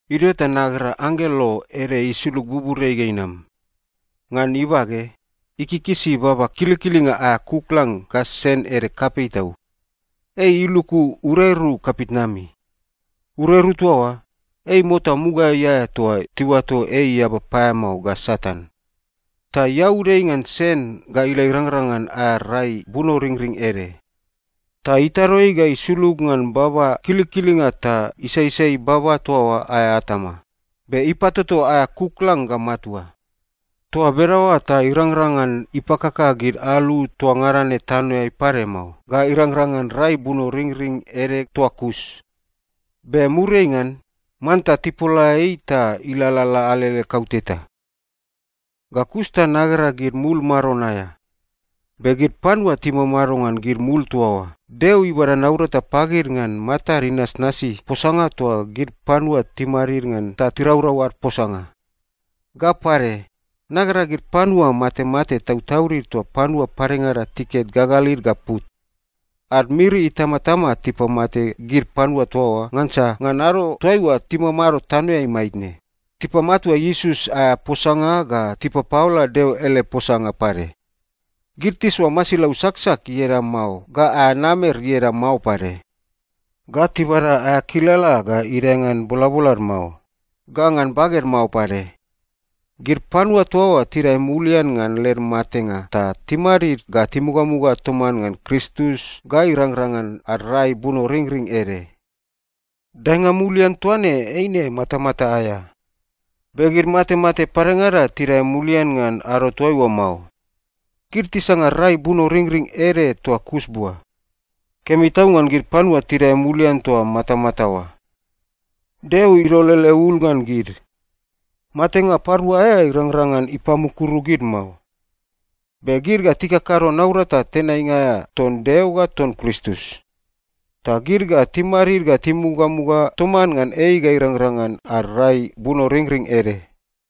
Idio ta nagera anggelo ede isulug buburiai ga inam. Ngan ibage, ikikisi baba kilikilinga aea kuklang ga sen ede kapei tau. Ei iluku ureru kapitnami. Ureru toa oa, ei mota mugaeai aea toa tiuato ei eaba paeamao ga Satan. Ta iaud ei ngan sen ga ila irangrang ngan aea rai bunoringring ede. Ta itado ei ga isulug ngan baba kilikilinga ta isaisai baba toa oa aea atama, be ipatoto aea kuklang ga matua. Toa bedaoa ta irangrang ngan ipakaka gid alu toa ngada ne tanoeai pade mao ga irangrang ngan rai bunoringring ede toa kus. Be muriai ngan, manta tipola ei ta ilalala alele kauteta. Ga kus ta nagera gid mul maron aea. Be gid panua timamado ngan gid mul toa oa, Deo ibada naurata pagid ngan matad inasnasi posanga toa gid panua timadid ngan ta tiraurau ad posanga. Ga pade, nagera gid panua matemate tautaudid toa panua padengada tiket gagalid ga put. Ad miri itamatama tipamate gid panua toa oa ngansa ngan ado toaiua timamado tanoeai maitne, tipamatua Iesus aea posanga ga tipapaola Deo ele posanga pade. Gid tisoa masilau saksak ieda mao ga aea namer ieda mao pade. Ga tibada aea kilala ga idae ngan bolabolad mao, ga ngan baged mao pade. Gid panua toa oa tidae mulian ngan led matenga ta timadid ga timugamuga toman ngan Kristus ga irangrang ngan ad rai bunoringring ede. Daenga mulian toa ne eine matamata aea. Be gid matemate padengada tidae mulian ngan ado toaiua mao. Gid tisanga rai bunoringring ede toa kus bua. Kemi tau ngan gid panua tidae mulian toa matamata oa. Deo idol ele ul ngan gid. Matenga parua aea irangrang ngan ipamukuru gid mao. Be gid ga tikakado naurata tenainga aea ton Deo ga ton Kristus. Ta gid ga timadid ga timugamuga toman ngan ei ga irangrang ngan ad rai bunoringring ede.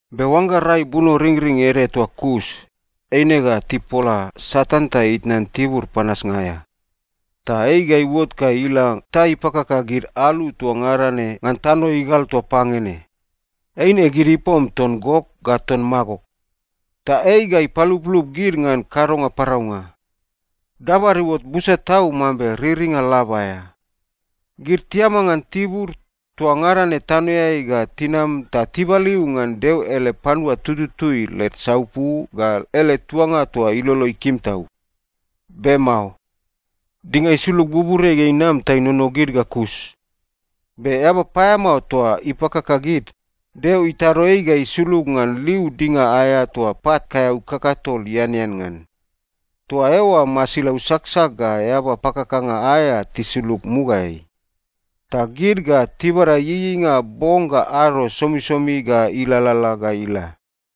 Be oangga rai bunoringring ede toa kus, eine ga tipola Satan ta itnan tibur panasnga aea. Ta ei ga iuot ga ila ta ipakaka gid alu toa ngada ne ngan tano igal toa pange ne. Eine gid ipom ton Gok ga ton Magok. Ta ei ga ipaluplup gid ngan kadonga paraunga. Dabad iuot busa tau mambe riringa lab aea. Gid tiama ngan tibur toa ngada ne tanoeai ga tinam ta tibaliu ngan Deo ele panua tututui led saupu ga ele tuanga toa ilolo ikim tau. Be mao. Dinga isulug buburiai ga inam ta inono gid ga kus. Be eaba paeamao toa ipakaka gid, Deo itado ei ga isulug ngan liu dinga aea toa pat kaeau kakatol ianean ngan. Toa eoa masilau saksak ga eaba pakakanga aea tisulug mugaeai. Ta gid ga tibada ieieinga bong ga ado somisomi ga ilalala ga ila.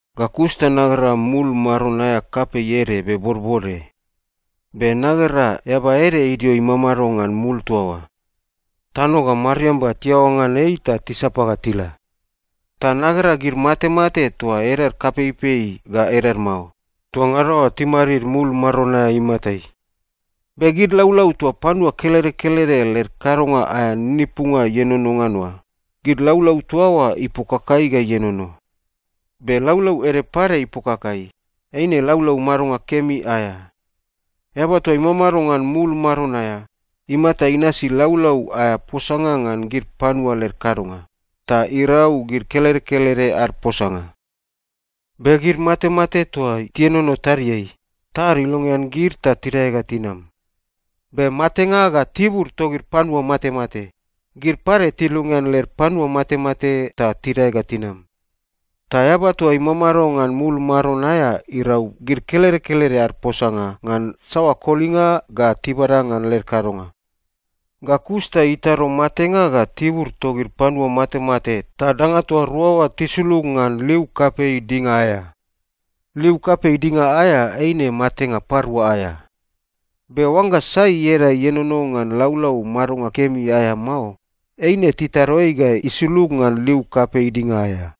Ga kus ta nagera mul maron aea kapei ede be bodbode. Be nagera Eaba ede idio imamado ngan mul toa oa. Tano ga mariamba tiaoa ngan ei ta tisapa ga tila. Ta nagera gid matemate toa edad kapeipei ga edad mao, toa ngada oa timadid mul maron aea imatai. Be gid laulau toa panua kelede kelede led kadonga aea ninipunga ienono ngan oa, gid laulau toa oa ipokakai ga ienono. Be laulau ede pade ipokakai, eine laulau madonga kemi aea. Eaba toa imamado ngan mul maron aea, imata inasi laulau aea posanga ngan gid panua led kadonga, ta irau gid kelede kelede ad posanga. Be gid matemate toa tienono tadiai, tad ilongean gid ta tidae ga tinam. Be Matenga ga Tibur togid Panua Matemate, gid pade tilongean led panua matemate ta tidae ga tinam. Ta Eaba toa imamado ngan mul maron aea irau gid kelede kelede ad posanga ngan saoa kolinga ga tibada ngan led kadonga. Ga kus ta itado Matenga ga Tibur togid Panua Matemate ta danga toa rua oa tisulug ngan liu kapei dinga aea. Liu kapei dinga aea eine matenga parua aea. Be oangga sai ieda ienono ngan laulau madonga kemi aea mao, eine titado ei ga isulug ngan liu kapei dinga aea.